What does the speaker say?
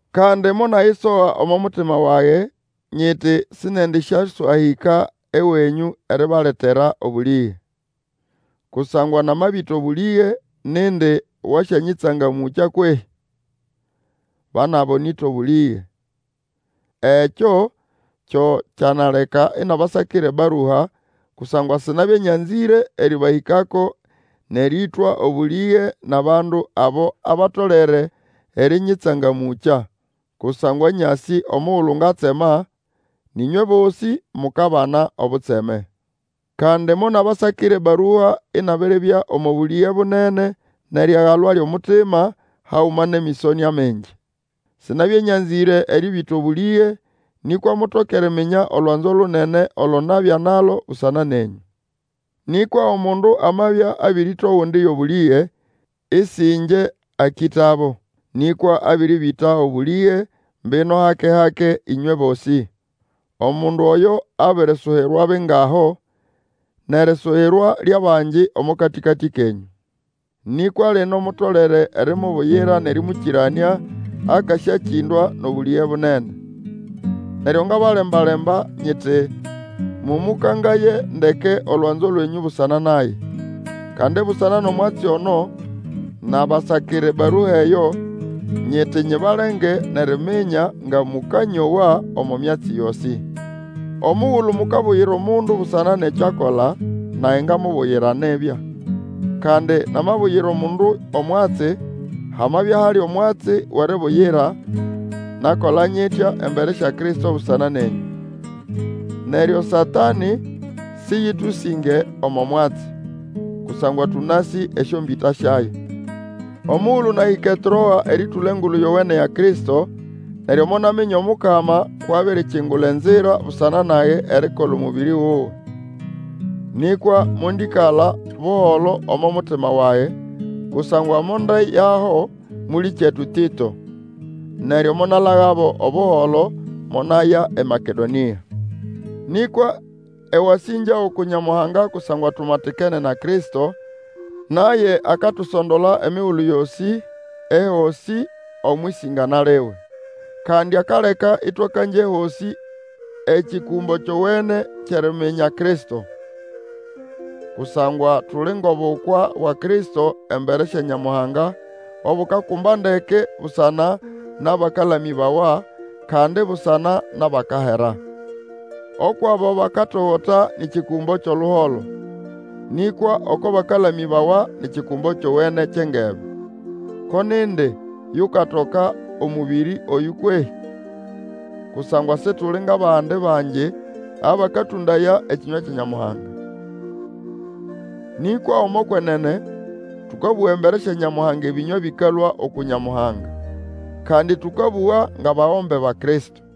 Kandi monayisoha omo mutima wage, nyiti sindiendĩsyaswahĩka ewenyũ eribaletera obũlĩge. Kusangwa namabĩta obũlĩge, nindi wasyanyĩtsangamũkya kwehĩ? Ba nʼabo nĩta obũlĩge. Ekyo kyo kyanaleka inabasakira ebarua, kusangwa sinabya nyanzĩre erĩbahĩkako nʼerĩĩtwa obũlĩge nʼabandu abo abatolere erĩnyĩtsangamũkya. Kusangwa nyasĩ omugulu ngatsema, nʼĩnywe bosĩ mukabana obutseme. Kandi monabasakira ebarua inabiribya omo bũlĩge bunene nʼeriagalwa lyʼomutima, haguma nʼemĩsonĩa mingi. Sinabya nyanzĩre erĩbĩta obũlĩge, nĩkwa mutoke eriminya olwanzo lunene olo nabya nalo busana nenyũ. Nĩkwa omundu amabya abĩrĩta ogundi yʼobũlĩge, Ĩsĩ ĩngye akĩtabo, nĩkwa abĩrĩbĩta obũlĩge, mbino hake-hake, ĩnywe bosĩ. Omundu oyo abirisuyirwa bingaho nʼerisuyirwa lyʼabangi omo katĩkatĩ kenyũ. Nĩkwa lino mutolere erimubuyira nʼerĩmũkĩranĩa, akasyakĩndwa nʼobũlĩge bunene. Neryo ngabalemba-lemba, mũkangaye ndeke olwanzo lwenyũ busana naye. Kandi busana nʼomwatsi ono nabasakira ebarua eyo, nyiti nyibalenge nʼeriminya nga mũkanyowa omo myatsi yosĩ. Omugulu mukabuyira omundu busana nʼekyo akola, nage ngamubuyira nibya. Kandi namabuyira omundu omwatsi, hamabya hali omwatsi wʼeribuyira, nakola nyitya embere sya Kristo busana nenyũ. Neryo Satanĩ sĩyĩtũsĩnge omo mwatsi, kusangwa tũnasĩ esyombĩta syayo. Omugulu nahĩka eTroa erĩtũla Engulu Yowene ya Kristo, neryo monaminya Omukama kwʼabirikingula enzira busana nage erikola omũbĩrĩ wuwe. Nĩkwa mondĩkala buholo omo mutima wage, kusangwa mondeyaho mũlĩkyetu Tĩto. Neryo monalagabo Obuholo, monaya eMakedonĩa. Nĩkwa ewasĩngya uku Nyamuhanga, kusangwa tumatikene na Kristo, naye akatusondola emigulu yosĩ ehosĩ omwʼĩsĩngana liwe. Kandi akaleka ĩtwakangya ehosĩ ekikumbo kyowene kyʼeriminya Kristo. Kusangwa tuli ngʼobukwa bwa Kristo embere sya Nyamuhanga obukakumba ndeke busana nʼabakalamĩbawa, kandi busana nʼabakahera. Ukwʼabo bakatogota ni kikumbo kyʼoluholo, nĩkwa oko bakalamĩbawa ni kikumbo kyowene kyʼengebe. Ko nindi yukatoka omũbĩrĩ oyũ kwehĩ? Kusangwa Situli ngʼabandi bangi abakatũndaya ekĩnywa kya Nyamuhanga. Nĩkwa omo kwenene, tũkabũga embere sya Nyamuhanga ebĩnywa bĩkalũa uku Nyamuhanga; kandi, tũkabũga ngʼabagombe ba Kristo.